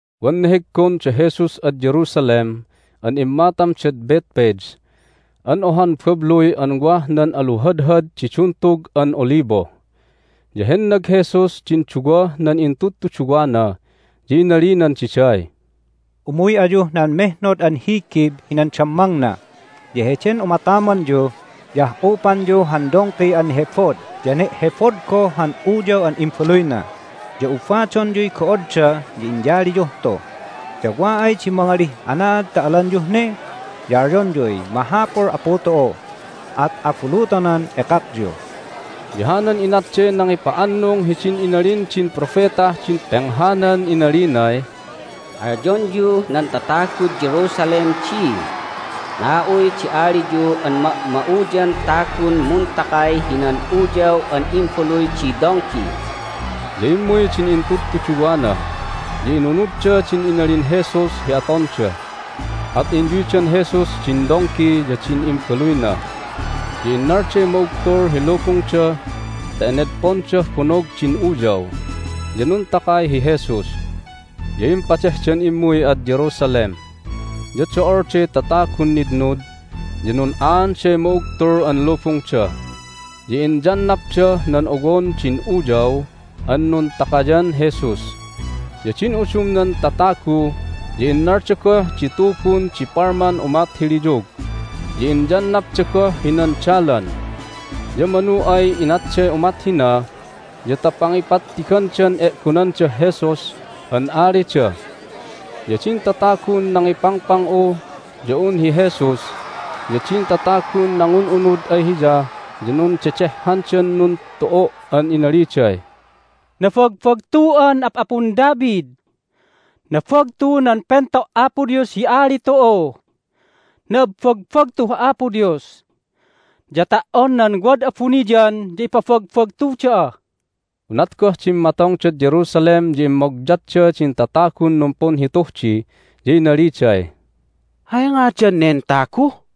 Wan neheggon da Jesus ad Jerusalem an immatamdad Bethphage an ohan babluy an wah nan aluhadhad di Duntug an Olibo. Ya hennag Jesus din duwah nan intudtuduwana, ya inalinan diday, "Umuy ayuh nan mehnod an higib hinan dammangna, ya heden umatamanyu ya ah'upanyu han dongki an nehebod ya ne'hebod goh han uyaw an imbaluyna. Ya ubadonyuy go'odda, ya inyaliyuh tu. Ya wa ay di mangalih, Anaad ta alanyuh ne? ya alyonyuy, Mahapul Apu tu'u! at abulutonan ekakyu." Ya hanan inatday nangipa'annung hidin inalin din propetah din penghanan inalinay, "Alyonyuh nan tatagud Jerusalem di, Na'uy di aliyu an ma'ma'uyan tagun muntakay hinan uyaw an imbaluy di dongki." Ya immuy din intudtuduwana, ya inunudda din inalin Jesus hi atonda. At inyuydan Jesus din dongki ya din imbaluyna, ya innalday ma'ugtul hi lubungda ta enedpondah bonog din uyaw, ya nuntakay hi Jesus. Ya impadehdan immuy ad Jerusalem, ya do'olday tatagun nitnud, ya nun'aanday ma'ugtul an lubungda, ya inyannapdah nan owon din uyaw an nuntakayan Jesus. Ya din udumnan tatagu ya innalda goh di tubun di palman umat hi liyug, ya inyannapda goh hinan dalan. Ya manu ay inatday umat hina ya ta pangipattigandan e'gonandah Jesus an alida. Ya din tatagun nangipangpang'u ya un hi Jesus ya din tatagun nangun'unud ay Hiya ya nundedehhandan nuntu'u' an inaliday, "Nabagbagtu'an Ap'apun David! Nabagtu nan Pento' Apo Dios hi Ali tu'u! Na'abbagbagtuh Apo Dios! Ya ta"on nan wad abuniyan ya ipabagbagtu da'a." Unat goh dimmatongdad Jerusalem ya immogyatda din tatagun numpunhituh di, ya inaliday, "Hay ngadan nen tagu?"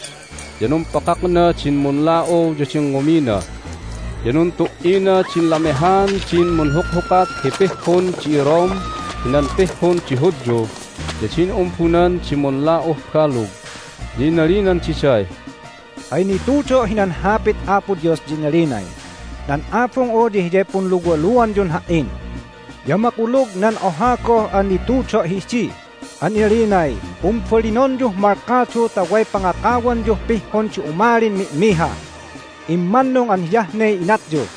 Immuy hi Jesus hinan Timplun Apo Dios, ya numpakakna din munla'u ya din ngumina. Ya nuntu"ina din lamehaan din munhukhukat hi pihhun di iRome hinan pihhun di Hudyu ya din umbunan di munla'uh balug. Ya inalinan diday, "Hay nitudo' hinan Hapit Apo Dios ya inalinay, Nan Abung'u ya hiyay punluwaluanyun Ha"in. Ya makulug nan oha goh an nitudo' hidi an inalinay, Pumbalinonyuh malkadu ta way pangakawanyuh pihhun di umalin mi'miha! Immannung an hiyah ne inatyu!"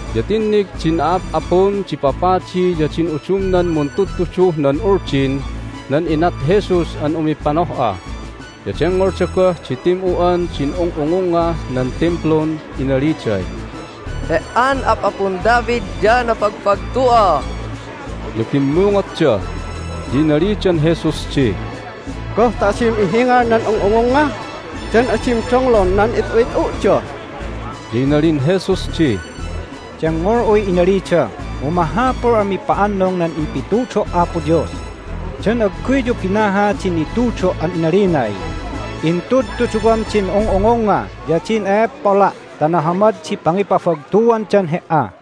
Ya tinnig din a'ap'apun di papadi ya din udumnan muntudtuduh nan Uldin nan inat Jesus an umipanoh'a, ya dengngolda goh di tim'u'an din ung'ungungngah nan Timplun inaliday, "He"an Ap'apun David ya nabagbagtu'a!" ya bimmungotda. Ya inalidan Jesus di, "Goh ta adim ihingal nan ung'ungungnga? Dan adim donglon nan it'u'it'u'da?" Ya inalin Jesus di, "Dengngol'uy inalida, mu mahapul an mipa'annung nan impitudo' Apo Dios. Dan agguyyu binaha din nitudo' an inalinay, Intudtuduwam din ung'ungungnga ya din e'eppola' ta nahamad di pangipabagtuandan He"a?"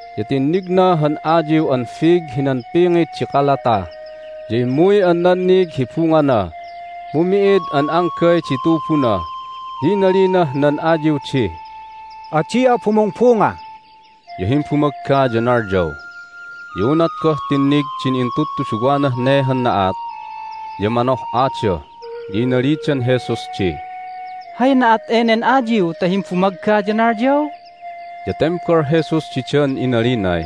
Ya tinnigna han ayiw an fig hinan pingit di kalata, ya immuy an nannig hi bungana, mu mi'id an anggay di tubuna. Ya inalinah nan ayiw di, "Adi'a bumungbunga!" Ya himbumagga ya nalyaw. Ya unat goh tinnig din intudtuduwanah ne han na'at ya manoh'ada, ya inalidan Jesus di, "Hay na'at enen ayiw ta himbumagga ya nalyaw?" Ya tembal Jesus didan inalinay,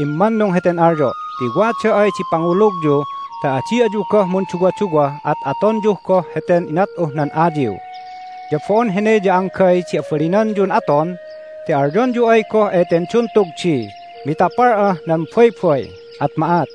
"Immanung heten alyo' ti wada ay di pangulugyu ta adi ayu goh munduwaduwa at atonyu goh heten inat'uh nan ayiw. Ya bo'on hene ya anggay di abalinanyun aton ti alyonyu ay goh eten duntug di, Mitapal'ah nan baybay! at ma'at.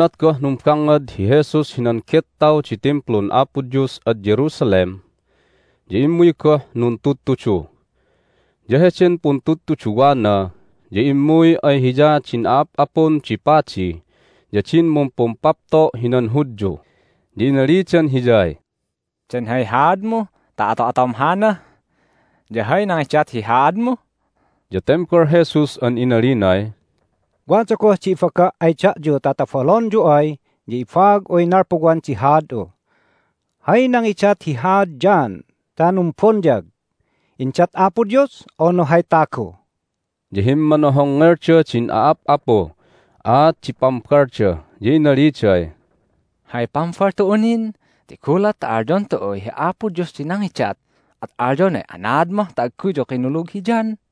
Unat goh numbangngad hi Jesus hinan gettaw di Timplun Apo Dios ad Jerusalem ya immuy goh nuntudtudu. Ya heden puntudtuduwana ya immuy ay Hiya din a'ap'apun di padi ya din mumpumpapto' hinan Hudyu, ya inalidan Hiyay, "Dan hay haadmu ta ato'atom hana? Ya hay nangidat hi haadmu?" Ya tembal Jesus an inalinay, "Wada goh di ibaga' ay da'yu ta tobalonyu ay ya ibaag'uy nalpuwan di haad'u. Hay nangidat hi haad John ta numbonyag? Indat Apo Dios, unu hay tagu?" Ya himmanohongngelda din a'ap'apuh aat di pambalda, ya inaliday, "Hay pambal tu'u nin? Ti gulat ta alyon tu'uy, Hi Apo Dios di nangidat, at alyonay, Anaad mah ta agguyyu kinulug hi John?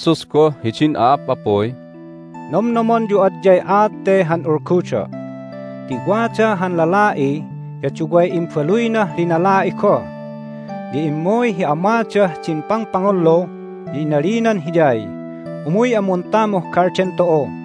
Inalin Jesus goh hidin a'ap'apuy, "Nomnomonyu adyay aat te han ulgudo'. Ti wada han lala'i, ya duway imbaluynah linala'i goh. Ya immuy hi amadah din pangpangullu, ya inalinan hiyay, Umuy'a muntamuh galden tu'u.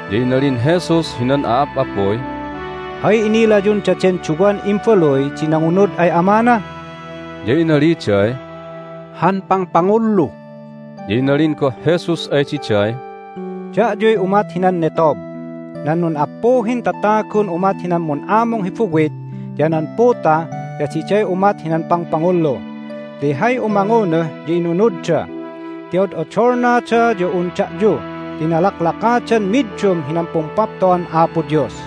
Ya inalin Jesus hinan a'ap'apuy, "Hay inilayun daden duwan imbaluy di nangunud ay amana?" Ya inaliday, "Han pangpangullu." Ya inalin goh Jesus ay diday, "Da'yuy umat hinan netob! Nan nun'appuhin tatagun umat hinan mun'amung hi buwit ya nan puta ya diday umat hinan pangpangullu ti hay umangunuh ya inunudda, ti od'odolnada ya un da'yu ti nalaklakadan middum hinan Pumpapto'an Apo Dios.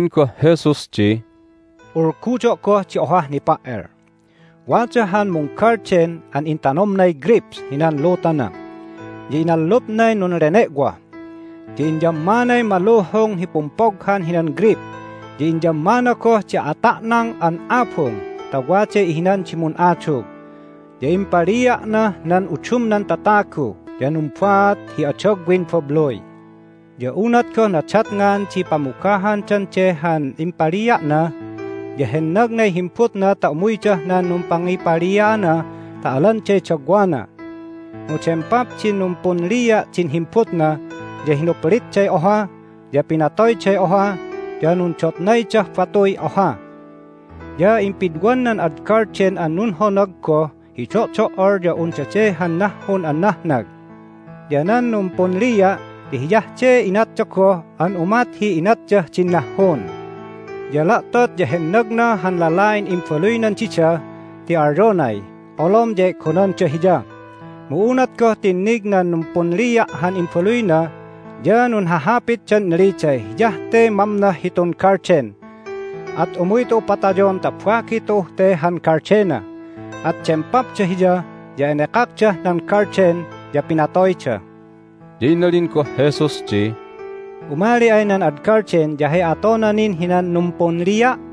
Inalin goh Jesus di, "Ulgudo' goh di ohah nipa"el. Wada han munggalden an intanomnay greyp hinan lutana, ya inallupnay nunlene'woh. Ya inyammanay maluhung hi pumpoghan hinan greyp, ya inyammana goh di ata'nang an abung ta waday ihinan di mun'adug. Ya impalia'nah nan udumnan tatagu, ya numbaat hi adagwin babluy. Ya unat goh nadatngan di pamugahandan de han impalia'na ya hennagnay himbutna ta umuydah nan numpangipalia'ana ta alanday dagwana. Mu dempap din numpunlia' din himbutna, ya hinuplitday oha, ya pinatoyday oha, ya nundotnaydah batuy oha. Ya impidwan nan ad galden an nunhonag goh hi do'do"ol ya un dade han nahhun an nahnag. Ya nan numpunlia' ya hiyah de inatda goh an umat hi inatdah din nahhun. Ya la'tot ya hennagna han lala'in imbaluynan dida ti alyonay, Olom ya e'gonanda hiya! Mu unat goh tinnig nan numpunlia' han imbaluyna ya nunhahapitdan inaliday, Hiyah te mamnoh hitun galden! At umuy tu'u patayon ta bagi tu'uh te han galdena! At dempapda hiya, ya enekakdah nan galden, ya pinatoyda." Ya inalin goh Jesus di, "Umali ay nan ad galden ya hay atona nin hinan numpunlia'?"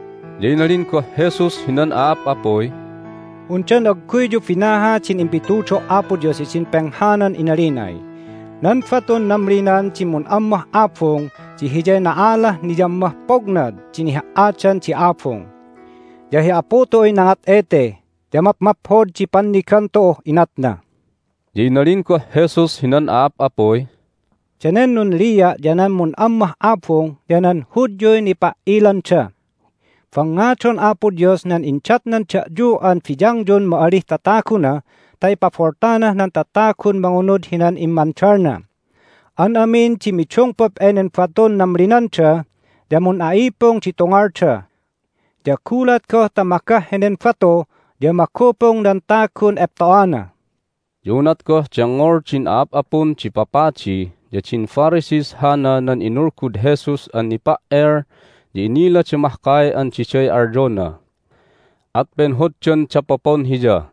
Ya inalin goh Jesus hinan a'ap'apuy, "Undan agguyyu binaha din impitudo' Apo Dios hidin penghanan inalinay, Nan batun namlinan di mun'ammah abung di hiyay na'alah niyammah pognad di niha"adan di abung. Ya hi Apu tu'uy nangat ete, ya mapmaphod di pannigan tu'uh inatna." Ya inalin goh Jesus hinan a'ap'apuy, "Danen nunlia' ya nan mun'ammah abung ya nan Hudyuy nipa"ilanda. Bangngadon Apo Dios nan indatnan da'yu an biyangyun ma'alih tataguna ta ipaboltanah nan tatagun mangunud hinan immandalna. An amin di midungpup enen batun namlinanda ya mun'a'ipung di tungalda. Ya gulat goh ta magah henen batu ya mangupung nan tagun epto'ana." Ya unat goh dengngol din a'ap'apun di papadi ya din Pharisees hana nan inulgud Jesus an nipa"el ya inilada mahkay an diday alyona. At penhoddan dapopon Hiya,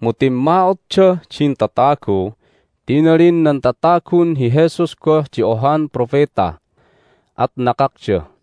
mu timma'otdah din tatagu ti inalin nan tatagun hi Jesus goh di ohan propeta. At nakakda.